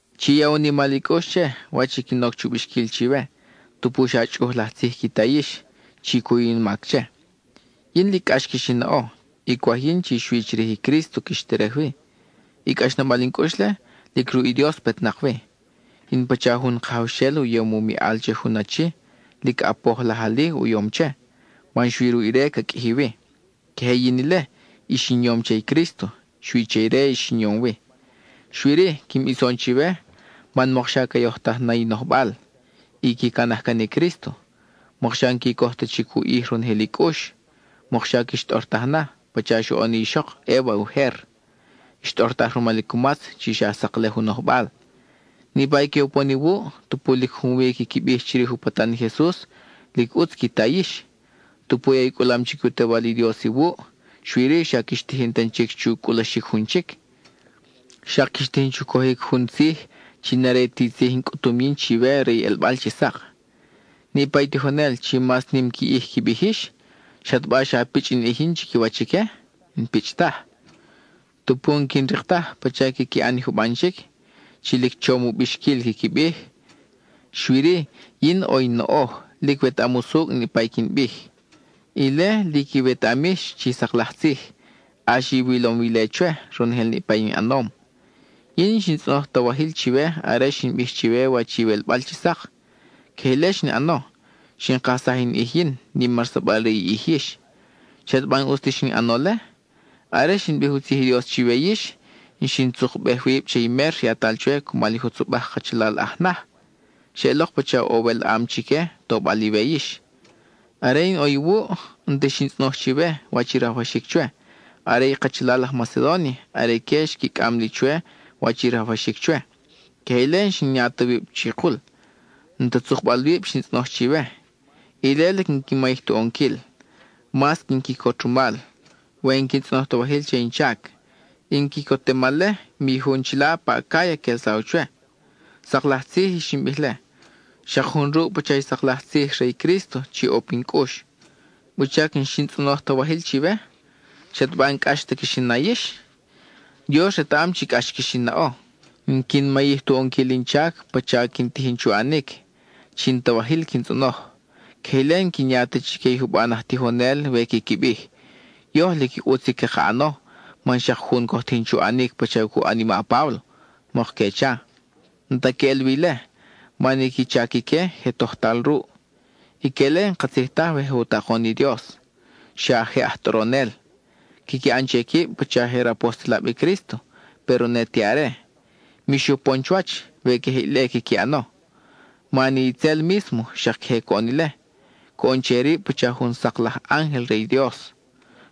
Chi ya u nimal i cʼux che, wach i quin oc chu bixquil chiwe; tupu xa chʼuj laj tzij qui ta yix, chi cuyu ni in mac che. Yin lic cʼax quix in naʼo, y cwaj yin chi xui chirij i Crísto quix terej wi; i cʼaxnabal in cʼux-le, lic ruʼ i Dios petnak wi. In pacha jun kajawxel u yom u miʼal che jun achi; lic ʼapoj laj ali u yom che, man xui ruʼ ire ca qʼuiji wi. Queje yin ile; yin ix in yom che i Crísto, xui che ire ix in yom wi. Xui-ri, quin bison chiwe, man mokxa ca yojtaj na i nojbal, y qui canaj can i Crísto; mokxa n-qui coj ta chic u ʼij ronojel i cʼux. Mokxa quix tʼortaj na, pacha xoʼon i ixok Eva ujer, xtʼortaj rumal i cumatz chi xa saklej u nojbal. Niʼpa i que upon iwuʼ, tupu lic junwi quiqui bij chirij u patan i Jesus, lic ʼutz qui ta yix. Tupu ya i cʼulam chic i u Tewal i Dios iwuʼ, xui-ri xa quix tijin tan chic chu cʼulaxic jun chic; xak quix tijin chu cojic jun tzij chi n-are ti tzij in cʼutum yin chiwe re i ʼelbal chi sak. Niʼpa i tijonel chi mas nim qui ʼij qui bij yix, ¿xataba xa pichʼ in ʼij yin chiquiwach ique? N-pichʼ taj. Tupu n-quin rik taj pacha quiqui ʼan i juban chic chi lic chom u bixquil quiqui bij, xui-ri yin ʼo in noʼoj; lic wetaʼam usucʼ niʼpa i quin bij. Ile, lic iwetaʼam yix chi sak laj tzij; ʼax iwilom wi ile chwe, ronojel niʼpa in ʼanom. Yin n-xin tzʼonoj ta wajil chiwe are xin bij chiwe wach i iwelbal chi sak; queje ile xin ʼano: xin kajsaj in ʼij yin, nimarsabal re i ʼij yix. ¿Xataba n-ʼus ta xin ʼano-le? Are xin bij u tzij i Dios chiwe yix, xin tzukbej wib che i mer yatal chwe cumal jutzobaj kachalal aj naj. Xeʼelok pacha ʼo welʼam chique, tobal iwe yix. Are in ʼo iwuʼ, n-ti xin tzʼonoj chiwe wach i rajwaxic chwe; are i kachalal aj Macedónia, are ique xqui cʼam li chwe wach i rajwaxic chwe. Queje ile n-xin ya ta wib chikul; n-ta tzukbal wib xin tzʼonoj chiwe; ile lic n-quin mayij tu ʼonquil. Mas quin quicot rumal, we n-quin tzʼonoj ta wajil che in chac. In quicotemal-le, mi jun chila pa Acáya quelsaw chwe. Sak laj tzij i xin bij-le, xak jun ruʼ pacha i sak laj tzij re i Crísto chi ʼo pin cʼux. ¿Wuchac n-xin tzʼonoj ta wajil chiwe? ¿Xataba n-cʼax ta quix in na yix? ¡Dios retaʼam chi cʼax quix in naʼo! N-quin mayij tu ʼonquil in chac pacha quin tijin chu ʼanic, chi n-ta wajil quin tzʼonoj; queje ile n-quin ya ta chique i juban aj tijonel we quiqui bij, “Yoj lic ʼutz i caka ʼano man xak jun coj tijin chu ʼanic pacha cu ʼan i ma Páblo,” mok que cha. N-ta queʼel wi ile man i qui chac ique je tojtal ruʼ. Ique-le n-katzij taj we je u takon i Dios; xa je aj tʼoronel. Quiqui ʼan che quib pacha je rapostelab i Crísto, péro ne te are. Mix upon chuwach, we queje ile quiqui ʼano, man i itzel mísmo xak queje coʼon ile; coʼon che rib pacha jun sak laj ángel re i Dios.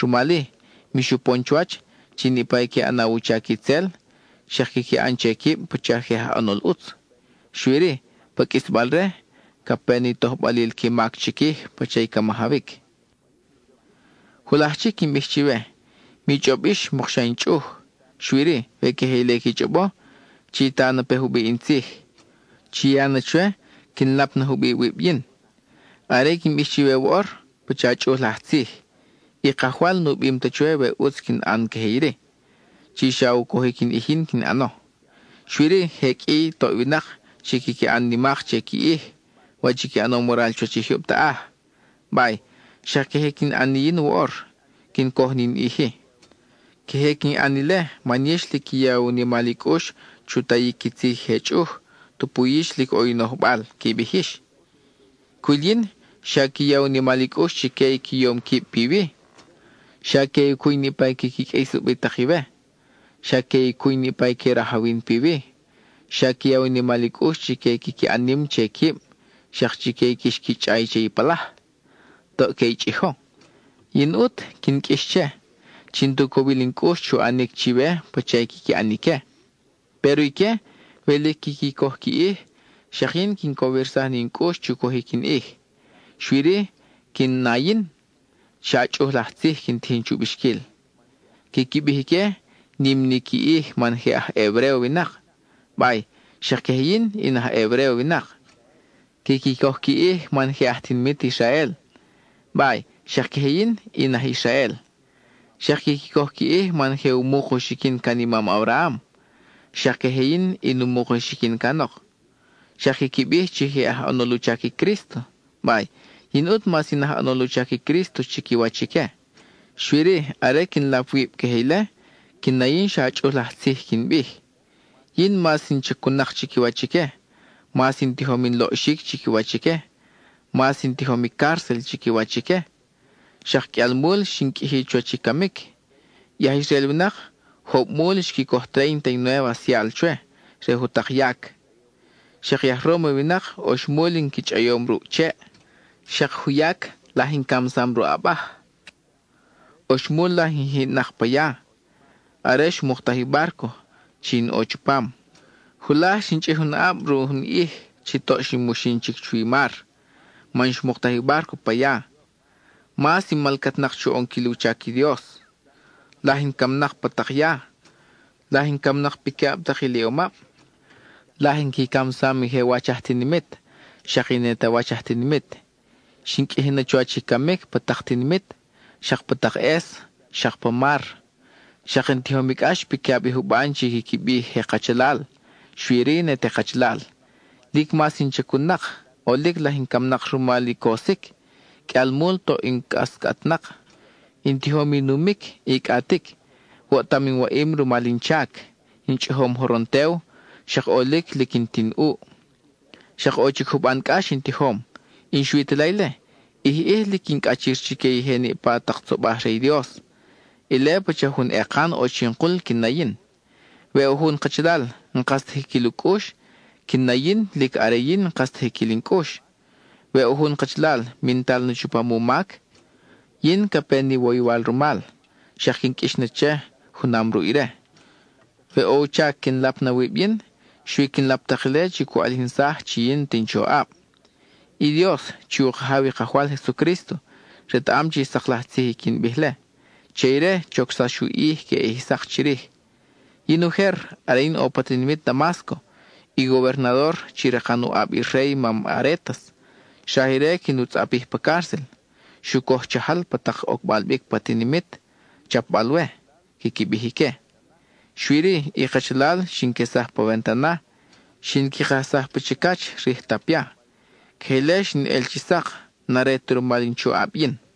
Rumal-i, mix upon chuwach chi niʼpa i que ʼanaw u chac itzel, xak quiqui ʼan che quib pacha je aj ʼanol ʼutz. Xui-ri, pa qʼuisbalre, ca pe ni tojbalil qui mac chiquij pacha i ca majawic. Julaj chic quin bij chiwe, mi chʼob yix mokxa in chʼuj. Xui-ri, we queje ile qui chʼobo, chi ta na pe jubiʼ in tzij; chi ya na chwe quin lap na jubiʼ wib yin. Are i quin bij chiwe woʼor, pacha chʼuj laj tzij; i Kajwal nu bim ta chwe we ʼutz quin ʼan queje iri, chi xa u cojic in ʼij yin quin ʼano. Xui-ri je qʼui i toʼ winak chi quiqui ʼan nimak che qui ʼij, wach qui ʼanom waral chuwach i jyub taʼaj; bay, xak queje quin ʼan ni yin woʼor, quin coj ni in ʼij-i. Queje quin ʼan ile man yix lic qui ya u nimal i cʼux chu tayic qui tzij i je chʼuj, tupu yix lic ʼo i nojbal, qui bij yix. Cwil yin xa qui ya u nimal i cʼux chique i qui yom quib piwi; xa que i cuy niʼpa i quiqui qʼuis ubitak iwe; xa que i cuy niʼpa i que rajawin piwi; xa qui ya u nimal i cʼux chique i quiqui ʼan nim che quib, xak chique i quix qui chʼay che i palaj; toʼ que i chʼijo. Yin ʼut, quin qʼuix che, chi n-ta u cowil in cʼux chu ʼanic chiwe pacha i quiqui ʼan ique. Péro ique, we lic quiqui coj qui ʼij, xak yin quin cowirsaj ni in cʼux chu cojic in ʼij, xui-ri quin na yin, xa chʼuj laj tzij quin tijin chu bixquil. Quiqui bij ique nim ni qui ʼij man je aj Hebréo winak; bay, xak queje yin, in aj Hebréo winak. Quiqui coj qui ʼij man je aj tinimit Israel; bay, xak queje yin, in aj Israel. Xak quiqui coj qui ʼij man je u muk u xiquin can i mam Abraham; xak queje yin, in u muk u xiquin canok. Xak quiqui bij chi je aj ʼanol u chac i Crísto; bay, yin ʼut mas in aj ʼanol u chac i Crísto chiquiwach ique. Xui-ri, are quin lap wib queje ile, quin na yin xa chʼuj laj tzij quin bij. Yin, mas in chacun-nak chiquiwach ique; mas in tijom in loʼxic chiquiwach ique; mas in tijom i cárcel chiquiwach ique, xak qʼuialmul xin qʼuiji chuwach i camic. I aj Israel winak jobmul xqui coj tréinta y nuéve asial chwe re jutak yac. Xak i aj Róma winak, oxmul in qui chʼayom ruʼ cheʼ; xak juyac laj in camsam ruʼ abaj. Oxmul laj in jiʼnak pa ya, are xmuktaj i bárco chi in ʼo chupam; julaj xin chʼij jun aʼab ruʼ jun ʼij chi toʼ quin muxin chic chuwi mar (man xmuktaj i bárco pa ya). Mas in malcatnak chu ʼonquil u chac i Dios, laj in camnak pa tak ya; laj in camnak piquiʼab tak iliʼomab; laj in qui camsam i je wach aj tinimit, xak i ne te wach aj tinimit. Xin qʼuiji na chuwach i camic pa tak tinimit, xak pa tak ʼes, xak pa mar. Xak in tijom i cʼax piqui ʼab i juban chi quiqui bij je kachalal, xui-ri, ne te kachalal. Lic mas in chacun-nak, ʼolic laj in camnak rumal i cosic. Qʼuialmul toʼ in cʼascʼatnak; in tijom i numic y cʼatic; woʼtam in waʼim rumal in chac; in chʼijom joron tew; xak ʼolic lic n-ti in ʼuʼ. Xak ʼo chic juban cʼax in tijom; y n-xui ta la ile, ʼij ʼij lic quin cʼachir chique i je niʼpa tak tzobaj re i Dios; ile pacha jun ekan ʼo chin kul quin na yin. We ʼo jun kachalal, n-kas ta jiquil u cʼux, quin na yin lic are yin n-kas ta jiquil in cʼux. We ʼo jun kachalal mintal na chupam u mac, yin ca pe ni woywal rumal, xak quin qʼuix na che junam ruʼ ire. We ʼo u chac quin lap na wib yin, xui quin lap tak ile chi cu ʼalijinsaj chi yin n-ta in choʼab. I Dios, chi u Kajaw i Kajwal Jesucrísto, retaʼam chi sak laj tzij i quin bij-le; che ire, chocsax u ʼij queʼe ʼij sak chirij. Yin ujer, are in ʼo pa tinimit Damásco, i gobernador, chi rakan u ʼab i rey mam Arétas, xraj ire quin u tzʼapij pa cárcel. Xu coj chajal pa tak ocbal bic pa tinimit, chapbal-we, quiqui bij ique. Xui-ri, i kachalal xin quesaj pa wantana; xin qui kajsaj pa chicach rij tapia. Queje ile xin el chi sak; n-are ta rumal in choʼab yin.